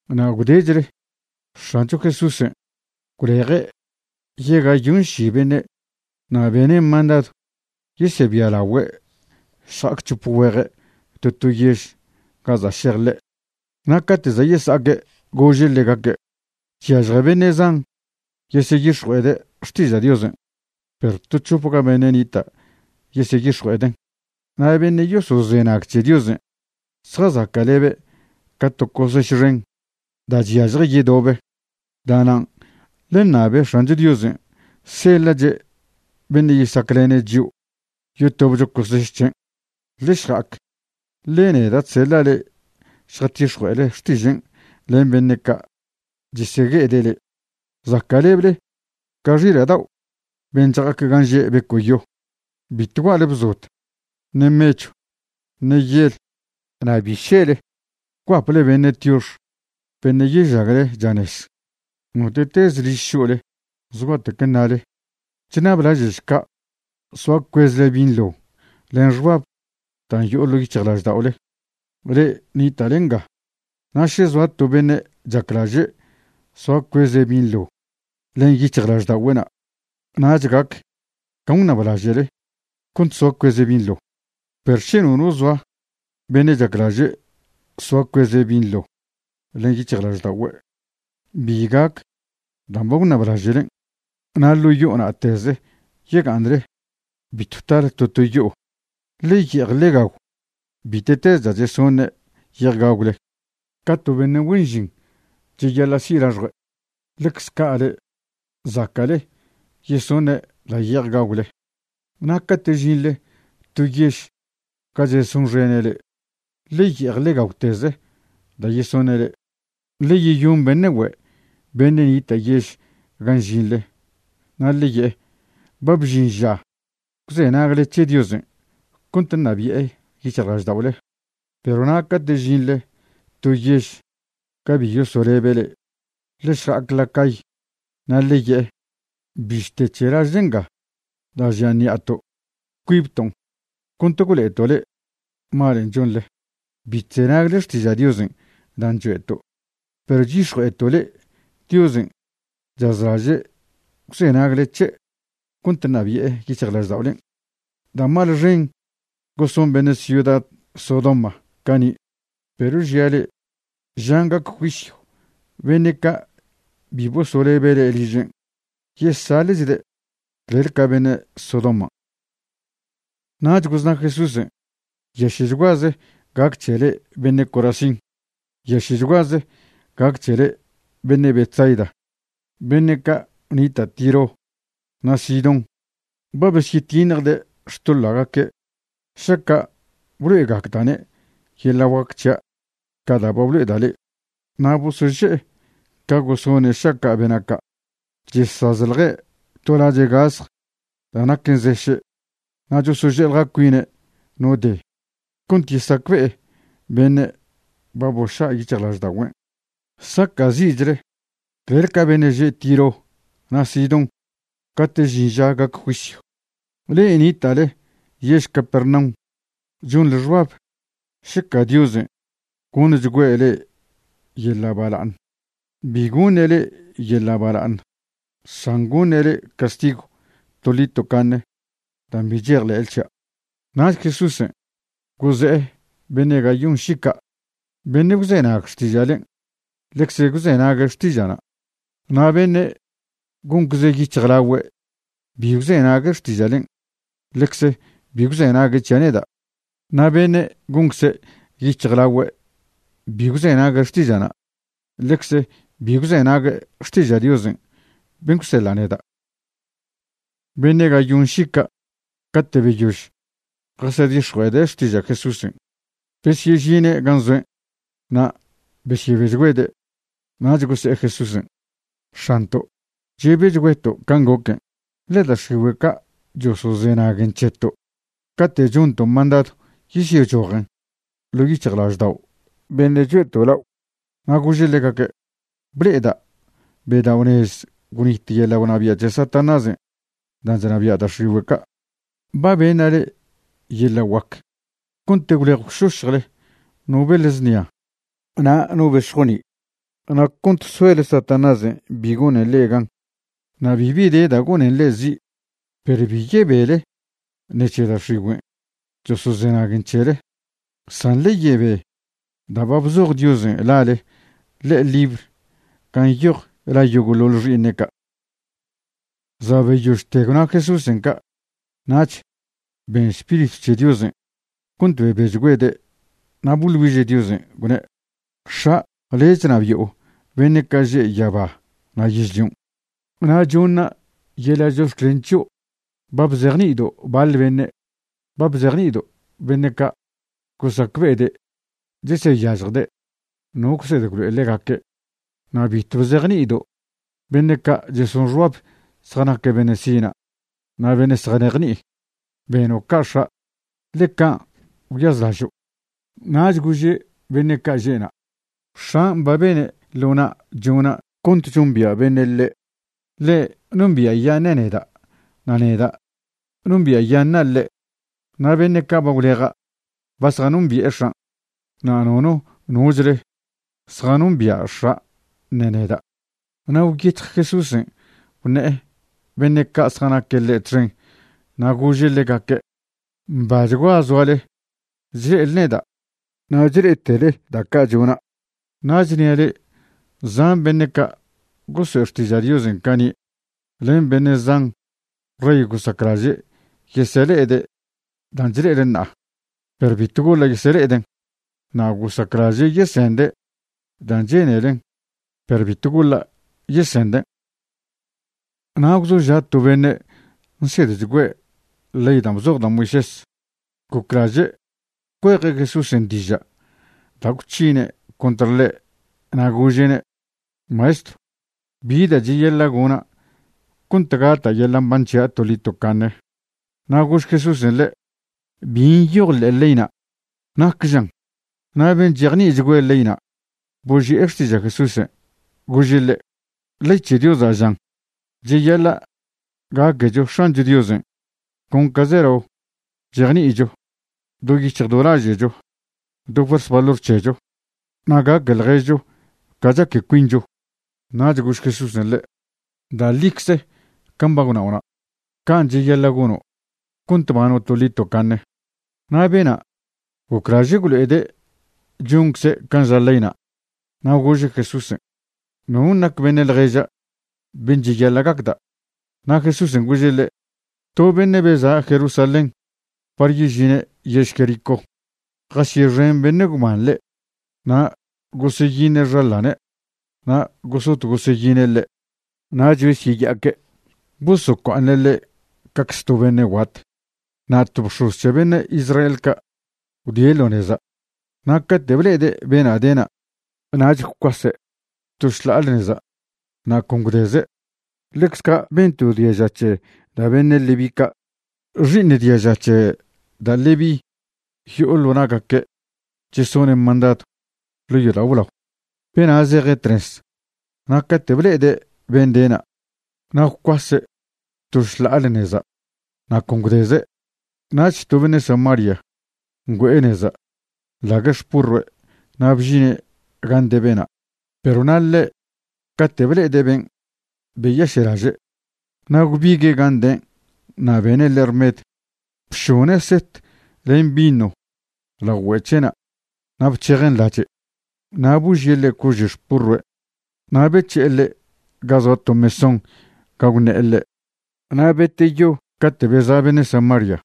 Na' gwdechle X̱ancho Jesúsen' gwleje' yegayonši beṉe' na' bene' mandadw yesebialagüe' šja'ac c̱hope güeje' to to yež ga za' šej ḻe'. Na' cate' za' yesa'aque' gože' ḻegaque': ―Chyažje beṉe' zan yeseyix̱jue'ede' xtiža' Diosen', perw to c̱hopga beṉe' nita' yeseyix̱jue'eden'. Na' beṉe' yosozenag c̱he Diosen' zjazaca'lebe' ca to coseš xen da' chyažje yedobe. Da'nan' ḻe ṉabe X̱ancho Diosen' seḻa'che' beṉe' yesaclene' chio' yotobcho coseš c̱hen'. Ḻe šja'ac, ḻe neda' chseḻa' le'e šjatix̱jue'ele xtižen' len beṉe' ca' chesegue'ede' le'e. Zaca'leble ca xila' dao' ben' chja'ac gan' že' beco'yo. Bitw gua'le bzod, ṉe mechw, ṉe yel, na' bi šele guaple beṉe' tiox beṉe' yežagle chanez. Note'tez liž šo'le zgua'tec ṉale: “Chṉablaže'šca' soa cuezle binḻo len xbab dan' yo'o ḻo' yic̱hjlažda'ole, le'e nita'le nga.” Na' še zoa to beṉe' chaclaže' soa cueze' binḻo len yic̱hjlažda'ogüe'na', nach gac can' gwṉablaže'le cont soa cueze' binḻo; perw še nono zoa beṉe' chaclaže' soa cueze' binḻo len yic̱hjlažda'ogüe', bi gac dan' ba gwṉablaže'len'. Na' ḻo' yo'o na'teze yega'aṉle. Bitw tale to to yo'o. Ḻe ye'ej ḻe gagw bite'teze da' chesone' ye'ej gagwle. Ca to beṉe' güen žin cheyaḻa' si' laxjue', ḻecz ca' le'e zaca'le yesoṉe' da' ye'ej gagwle. Na' cate' žinḻe to yež ga chesonxene' le'e, ḻe ye'ej ḻe gagwteze da' yesoṉe' le'e. Ḻe yeyon beṉe' güe' beṉe' nita' yež gan' žinḻe, na' ḻe' ye'e: “Ba bžin ža gwzenagle c̱he Diosen' cont ṉabi'e yic̱hjlažda'ole.” Perw na' cate' žinḻe to yež ga bi yosolebe' le'e, ḻe šja'ac la cay na' ḻe ye'e: “Bište c̱he lažle nga da' žia ṉi'ato', cuibton' cont gwlo'eto' le'e malen' chonḻe bi chzenagle xtiža' Diosen' dan' choe'to'. Perw chyix̱jue'eto' le'e Diosen' chazlaže' gwzenagle c̱he' cont ṉabi'e yic̱hjlažda'olen'.” Da' mal xen goson beṉe' ciuda Sodoma cani', perw žia' le'e, žan' gac juisyw beṉe' ca' bi bosolebe' le'e ližen', yesaḻe'chde' clel ca beṉe' Sodoman'. Nach gozna Jesúsen': ―¡Nyaše'chguaze gac c̱he le'e beṉe' Corazín! ¡Nyaše'chguaze gac c̱he le'e beṉe' Betsaida! Beṉe' ca' nita' Tiro na' Sidón ba' besyetiṉjde' xtoḻa'gaque' šaca' blo'egacda'ne' yeḻa' guac c̱hia' ca da' ba blo'eda' le'e. Na' bosoše'e ca gosone' šaca' bena' ca', chesazḻje' to lache' gasj da' naquen zeše' na' chosože'eḻja cuine' no de cont yesacbe'e beṉe' ba boša' yic̱hjlažda'ogüen'. Saca'zi'chle clel ca beṉe' že' Tiro na' Sidón cate' žin ža gac juisyw. Le'e nita'le yež Capernaum chonḻe xbab šeca Diosen' goṉchgüe' le'e yeḻa' bala'aṉ. Bi goṉe' le'e yeḻa' bala'aṉ san goṉe' le'e castigw toḻi tocaṉe dan' bi chejḻe'le c̱hia'. Nach Jesúsen' goze'e beṉe' gayonši ca': ―Beṉe' gwzenag xtiža'len' ḻecze gwzenague' xtiža'na', na' beṉe' goncze yic̱hjlagüe' bi gwzenague' xtiža'len', ḻecze bi gwzenague' c̱hia' neda'. Na' beṉe' goncze yic̱hjlagüe' bi gwzenague' xtiža'na', ḻecze bi gwzenague' xtiža' Diosen' ben' gwseḻa' neda'. Beṉe' gayonši ca' cate' beyož jasedix̱jue'ede' xtiža' Jesúsen', besyežine' gan' zoen' na' besyebechgüede'. Nach gose'e Jesúsen': ―X̱anto', chebechgüeto' can' goquen', ḻe da' x̱igüe' ca' chosozenaguen c̱heto' cate' chonto' mandadw yesyechojen ḻo' yic̱hjlaždao' beṉe' choe'to' lao'. Na' gože' ḻegaque': ―Ble'eda' bedao'nez gwnit yeḻa' gwnabia' c̱he Satanásen' dan' chnabia' da' x̱igüe' ca'. Ba beṉa' le'e yeḻa' guac cont gwlej gwšošjle no beḻ znia na' no bex̱joni' na' cont soele Satanásen' bi gonen le'e gan. Na' bibi de da' gonen le'e zi'. Perw bi yebele ṉec̱he da' x̱igüen' chosozenaguen c̱hele, san ḻe yebe da' ba bzoj Diosen' lale ḻe'e libr gan' nyoj la yogo'ḻoḻ xi'iṉe' ca'. Za' beyožte gwna Jesúsen' ca' nach ben Spiritw c̱he Diosen' cont bebechgüede' na' boḻ güiže' Diosen', gwne': ―X̱a', le' chnabi'o beṉe' ca' že' yaba na' yežlion'. Na' choṉa' yeḻa' chox̱clen c̱hio' ba bzejni'ido' baḻ beṉe'. Ba bzejni'ido' beṉe' ca' gosacbe'ede' cheseyažjde' no gwsed gwlo'e ḻegaque'. Na' bitw bzejni'ido' beṉe' ca' cheson xbab zjanaque' beṉe' sina' na' beṉe' zjanejni'i. Beno' ca' X̱a', ḻe can' gwyazlažo'. Nach gože' beṉe' ca' že'na': ―X̱an' ba bene' ḻo na' chona' cont chombia' beṉe' ḻe'. Ḻe' nombia'yaṉe' neda', na' neda' nombia'yaṉa' ḻe'. Na' beṉe' ca' ba gwleja' ba zjanombi'e X̱an'. Na' nono nochle zjanombia' X̱a' ṉe neda'. Na' gwyec̱hj Jesúsen' gwṉe'e beṉe' ca' zjanaque' ḻe' txen na' gože' ḻegaque': ―Mbachgua zoale chle'ele neda' na' chle'etele da' ca' chona'. Na' chnia' le'e zan beṉe' ca' goso'e xtiža' Diosen' cani' len beṉe' zan rey gosaclaže' yesele'ede' dan' chle'ele ṉa'a, perw bitw goḻa' yesele'eden', na' gosaclaže' yesende' dan' chenelen', perw bitw goḻa' yesenden'. Na' gwzoža' to beṉe' nsedchgüe' ley dan' bzoj da' Moisés, goclaže' cueje' Jesúsen' diža' da' gwc̱hine' contr ḻe' na' gože'ne': ―Maestrw, ¿bi da' cheyaḻa' gona' cont gata' yeḻa' mban c̱hia' toḻi tocaṉe? Na' gož Jesúsen' ḻe': ―¿Bi nyoj ḻe'e leyna'? ¿Nac žan? Na' ben' chejni'ichgüe' leyna' boži'e xtiža' Jesúsen', gože' ḻe': ―Ley c̱he Diosa' žan: “Cheyaḻa' gaquecho X̱ancho Diosen' con ca zelao chejni'icho, do yic̱hj do laže'cho, do fuers valor c̱hecho, na' gaque ḻježcho ca chaque cuincho.” Nach gož Jesúsen' ḻe': ―Da' ḻicze can' ba gwnao'na'. Can' cheyaḻa' gono' cont bano' toḻi tocaṉe. Na' bena' goclaže' gwlo'ede' choncze' can' ža leyna', na' gože' Jesúsen': ―¿Non' nac beṉe' ḻježa' ben' cheyaḻa' gacda'? Na' Jesúsen' gože' ḻe': ―To beṉe' beza' Jerusalén par yežine' yež Jericó, jasyexen beṉe' gwban ḻe'. Na' goseyiṉe' xaḻane' na' gosot goseyine' ḻe'. Nach besyeya'aque' bosocua'aṉe' ḻe' cacze to beṉe' guat. Na' to bx̱oz c̱he beṉe' Israel ca' gwdie' ḻo neza', na' cate' ble'ede' bena' dena', nach gwcuase' to šḻa'ale neza' na' con gwdeze'. Ḻecz ca' ben to diaža c̱he da' beṉe' Leví ca'. (Xi'iṉ diaža c̱he da' Leví yo'o ḻo na'gaque' chesoṉe' mandadw ḻo' yodao' blao.) Bena' zeje' tnez na' cate' ble'ede' ben' dena', na' gwcuase' to šḻa'ale neza' na' con gwdeze'. Nach to beṉe' Samaria ngüe'e neza' nḻague' xpurrue' na' bžine' gan' de bena', perw na' ḻe' cate' ble'ede' ben' beyaše'laže'. Na' gwbigue' gan' de' na' bene' ḻe' rmed, bšone' set len vino lao güe' c̱he'na' na' bc̱hejen' lache'. Na' božie' ḻe' cože' xpurrue' na' bec̱he'e ḻe' ga zoa to mesón ga gwṉe'e ḻe'. Na' beteyo cate' beza' beṉe' Samaria,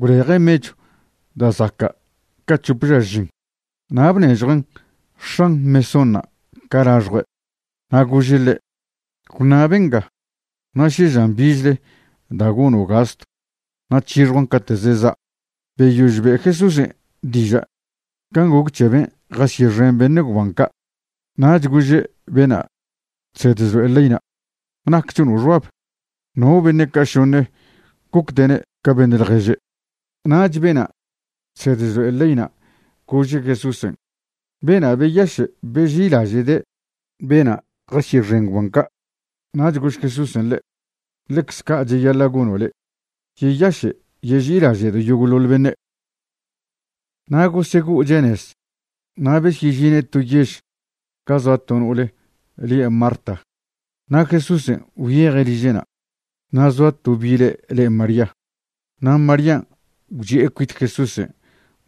gwleje' mechw da' zaca' ca c̱hop ža žin na' bnežjuen' x̱an mesónṉa' ca laxjue', na' gože' ḻe': “Gwṉa' benga na' še žan bichle da' gono' gastw na' c̱hixjuan' cate' zeza'a.” Beyož be' Jesúsen' diža' can' goc c̱he ben' jasyexen beṉe' gwban ca', nach gože' bena' chsed chlo'e leyna': ―¿Nac chono' xbab? ¿No beṉe' ca' šoṉe gocde'ne' ca beṉe' ḻježe'? Nach bena' chsed chlo'e leyna' gože' Jesúsen': ―Bena' beyaše' beži'ilaže'de' bena' jasyexen gwban ca'. Nach gož Jesúsen' ḻe': ―Ḻecze ca' cheyaḻa' gono' le', yeyaše' yeži'ilaže'do' yogo'ḻoḻ beṉe'. Na' gosego'oche' nez na' besyežine' to yež ga zoa to no'ole lie' Marta, na' Jesúsen' gwyeje' liže'na'. Na' zoa to bile' le María. Na' Marían' gwchi'e cuit Jesúsen'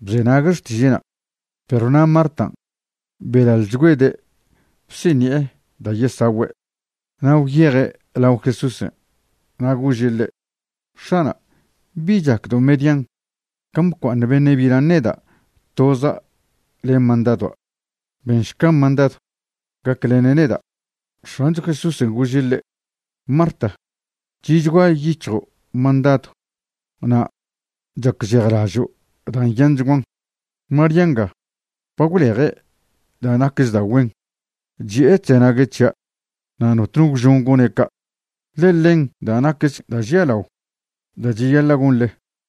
bzenague' xtiže'na'. Perw na' Martan' belaḻchgüede' bsiṉi'e da' yesagüe'. Na' gwyeje' lao Jesúsen' na' gože' ḻe': ―X̱ana', ¿bi chacdo' median can' bcua'aṉ beṉe' bilan' neda' toza' len mandadua'? Benšca mandadw gaclene' neda'. X̱ancho Jesúsen' gože' ḻe': ―Marta, chi'chgua yic̱hjo' mandadua' na' chacžejlažo' dan' nyanchguan. María nga ba gwleje' da' naquech da' güen. Chi'e chzenague' c̱hia', na' notno gwžon gone' ca', ḻe ḻen da' nacch da' žialao da' cheyaḻa' gonḻe.